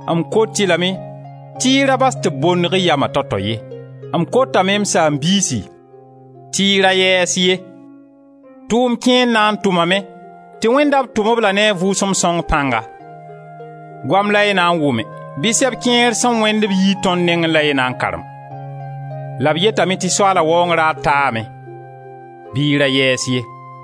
m kot-y lame tɩ y ra bas tɩ b bondg y yama tao tao ye. M kotane, m saam-biisi, tɩ y ra yɛɛs ye. Tʋʋm kẽer na tʋmame tɩ wẽnda b tʋm-b-la ne a Vʋʋsem Sõng pãnga. Goam la y na n wʋme, bɩ sɛb kẽer sẽn wẽnd b yii tõnd nengẽ la y na n karem. La b yetame tɩ Soaala Waoong raar taame, bɩ y ra yɛɛs ye.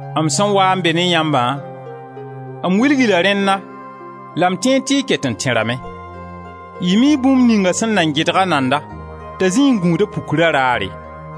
M sẽn waa n be ne yãmbã m wilg-y la rẽnna, la m tẽed tɩ y ket n tẽrame. Y mii bũmb ninga sẽn nan gɩdg a nanda t'a zĩi n gũud a pukra raare.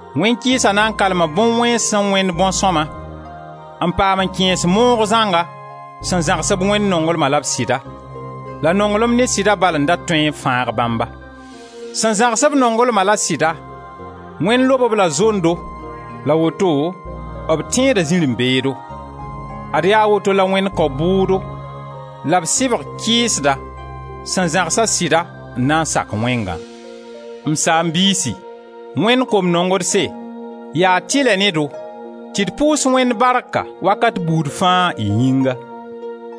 Wẽn-kɩɩsa na n kalma bõn-wẽns sẽn wẽnd bõn-sõma, n paam n kẽes moog zãnga sẽn zãgsb Wẽnd nonglma la b sɩda — la nonglma ne sɩda bal n da tõe n fãag bãmba. Sẽn zãgs-b nonglma la sɩda Wẽnd lob-b la zondo la woto b tẽeda zirẽ-beedo. Ad yaa woto la Wẽnd kao bʋʋdo la b sɩbg kɩɩsda, sẽn zãgsa sɩda n na n sak wẽngã. M saam-biisi, Wẽnd kom-nongdse, yaa tɩlɛ ne-do, tɩ d pʋʋs Wẽnd barka wakat buud fãa y yĩnga.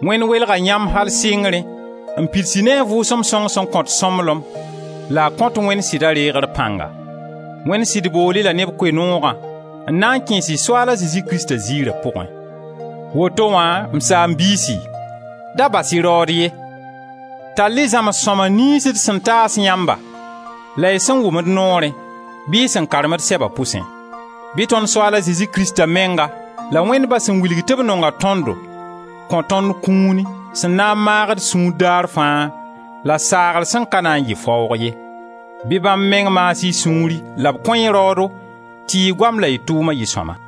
Wẽnd welga yãmb al sɩngrẽ n pids-y ne a Vʋʋsem Sõng sẽn kõt sõmblem la a kõt Wẽnd sɩda reegr pãnga. Wẽnd sɩd bool-y-la ne b Koe-noogã n na n kẽes-y Soaala Zezi Krista ziira pʋgẽ. Woto wã, m saam-biisi, da bas-y raood ye. Tall-y zãms sõma niyns d sẽn taas yãmba la y sẽn wʋm d noorẽ bɩ y sẽn karem d sɛba pʋsẽ. Bɩ tõnd Soaal a Zezi Krista menga la Wẽnd Ba sẽn wilg tɩ b nonga tõndo kõ tõnd kũuni sẽn na n maag d sũur daar fãa la saagr sẽn ka na n yɩ fãoog ye. Bɩ bãmb meng maas y sũuri la b kõ-y raoodo, tɩ y goam la y tʋʋma yɩ sõma.